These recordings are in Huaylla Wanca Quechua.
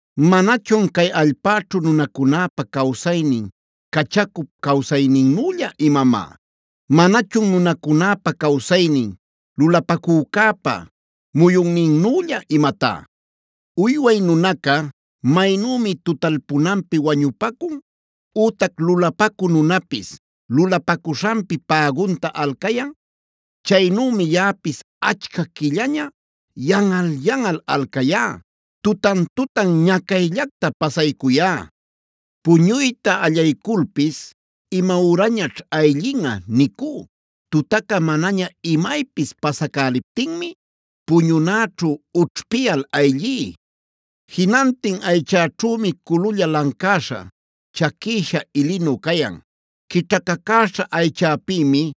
“¿Manachun cay allpäćhu nunacunäpa cawsaynin cachacup cawsayninnülla imamá? ¿Manachun nunacunäpa cawsaynin lulapacücäpa muyunninnülla imatá? Uyway nunaca maynümi tutalpunanpi wañupacun, ütac lulapacü nunapis lulapacuśhanpi pägunta alcayan, chaynümi yaꞌapis achca quillaña yanꞌal-yanꞌal alcayá. Tutan-tutan ñacayllacta pasaycuyá. Puñuyta allayculpis: ‘¿Imayürañaćh ayllinꞌa?’ nicú. Tutaca manaña imaypis pasacäliptinmi puñunäćhu ućhpiyal ayllí. Jinantin aychäćhümi cululla lancäśha, chaquïsha ilinu cayan; quićhacacäśha aychäpïmi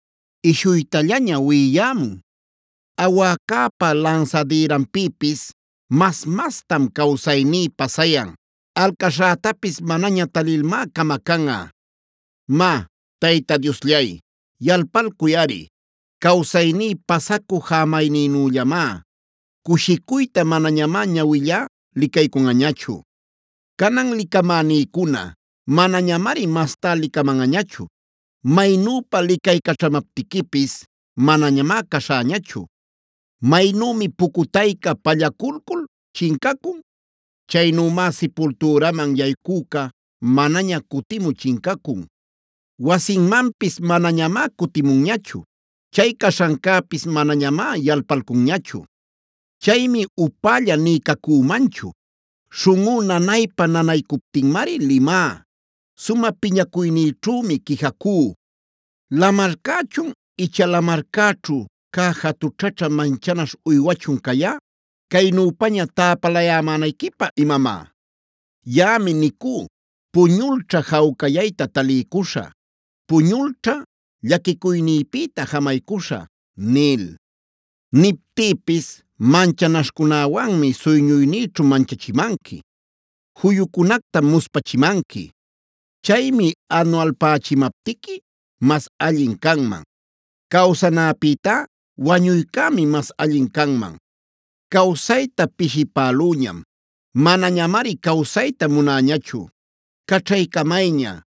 ishuytayllaña wiꞌiyämun. Awäcäpa lansadïranpïpis mas-mastam cawsayní pasayan. Alcaśhätapis manaña talilmá camacanꞌa. “Má, Tayta Diosllay, yalpalcuyꞌari. Cawsayní pasacü jämaynïnüllamá. Cushicuyta manañamá ñawillá licaycunꞌañachu. Canan licamänïcuna manañamari mastá licamanꞌañachu. Maynüpa licaycaćhamaptiquipis manañamá caśhäñachu. Maynümi pucutayca pallaculcul chincacun; chaynümá sipultüraman yaycüca, manaña cutimü chincacun. Wasinmanpis manañamá cutimunñachu. Chay caśhancäpis manañamá yalpalcunñachu. “Chaymi upälla nï cacümanchu. Śhunꞌú nanaypa-nanaycuptinmari limá. Sumä piñacuynïćhümi quijacú. ¿¡Lamarcächun icha lamarcäćhu cä jatućhaćhä manchanaśh uywachuna cayá caynüpaña täpalayämänayquipä imamá!? Yaꞌami nicú: ‘Puñulćha jawcayayta taliycuśhä. Puñulćha llaquicuynïpïta jamaycuśhä’ nil. Niptïpis manchanaśhcunäwanmi suyñuynïćhu manchachimanqui; juyucunactam muspachimanqui. Chaymi anualpächimaptiqui mas allin canman. Cawsanäpïtá wañuycämi mas allin canman. ¡Cawsayta pishipälüñam! Manañamari cawsayta munäñachu. Caćhaycamayña,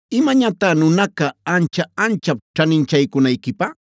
¿Imañatá nunaca ancha-anchap ćhaninchaycunayquipä?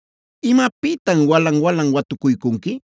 ¿Imapïtam walan-walan watucuycunqui?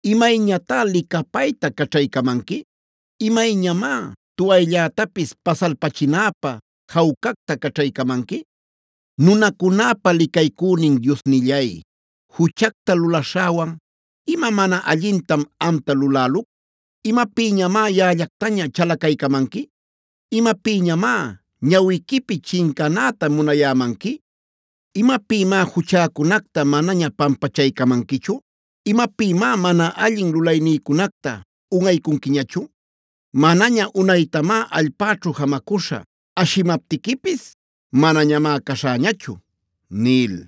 ¿Imayñatá licapayta caćhaycamanqui? ¿Imayñamá tuwayllätapis pasalpachinäpä jawcacta caćhaycamanqui? Nunacunäpa licaycünin Diosnillay, juchacta lulaśhäwan ¿ima mana allintam amta luläluc? ¿Imapïñamá yaꞌallactaña chalacaycamanqui? ¿Imapïñamá ñawiquipi chincanäta munayämanqui? ¿Imapïmá juchäcunacta manaña pampachaycamanquichu? ¿Imapïmá mana allin lulaynïcunacta unꞌaycunquiñachu? Manaña unaytamá allpäćhu jamacuśhä; ashimaptiquipis manañamá caśhäñachu” nil.